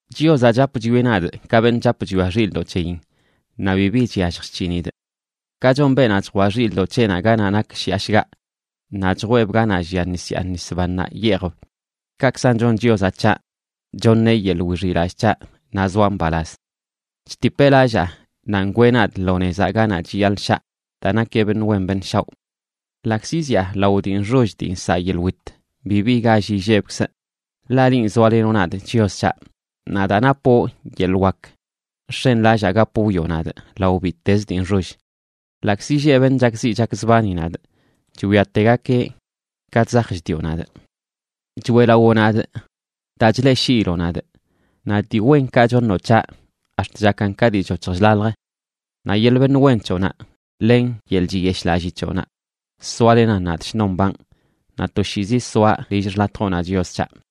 Chiozaꞌ chap chwieꞌ nadꞌ, ka beṉꞌ chap chwia xilꞌdoꞌ c̱heyin, naꞌ bibi chyallj chc̱hinidꞌ. Ka chon beenaꞌ chjwaꞌ xilꞌdoꞌ c̱heꞌnaꞌ ganaꞌ nak shiꞌa shgaꞌ, naꞌ chjweeb ganaꞌ llia nis yaa nis bannaꞌ yeejb, kaꞌkzan chon Chiozaꞌ c̱haꞌ, choṉeꞌ yeḻꞌ wixiꞌlallꞌ c̱haꞌ naꞌ zoaꞌ mbalaz. Chtipeꞌ lallaa, naꞌ ngwee nadꞌ lo nezaꞌ ganaꞌ chiyaḻꞌ shaa daa nakeꞌ beṉꞌ wen beṉꞌ shaoꞌ. Ḻaꞌkzi zyaa lao dii nxoll dii nsaꞌ yeḻꞌ wit, bibi gall illebkzꞌ, ḻaꞌ linꞌ, zoalenoꞌ nadꞌ, Chios c̱haꞌ. Naꞌ daa napoꞌ yeḻꞌ wak, nx̱enlallaa gap wwioꞌ nadꞌ lao bittezə dii nxoll. Ḻaꞌkzi lleꞌ beṉꞌ chakziꞌ chakzbani nadꞌ, chwiategakeꞌ ka chzaj chdioꞌ nadꞌ. Choeꞌlawoꞌ nadꞌ daa chleꞌshiiloꞌ nadꞌ, naꞌ dii wenkaꞌ choṉoꞌ c̱haꞌ ax̱t chakan ka dii choc̱hj chlalj. Naꞌ yeḻꞌ beṉꞌ wen c̱hoꞌnaꞌ len yeḻꞌ chiyeshꞌlallii c̱hoꞌnaꞌ soalenan nadꞌ shnon mbanꞌ, naꞌ toshiizi soaꞌ lill xḻatjoꞌnaꞌ, Chios c̱haꞌ.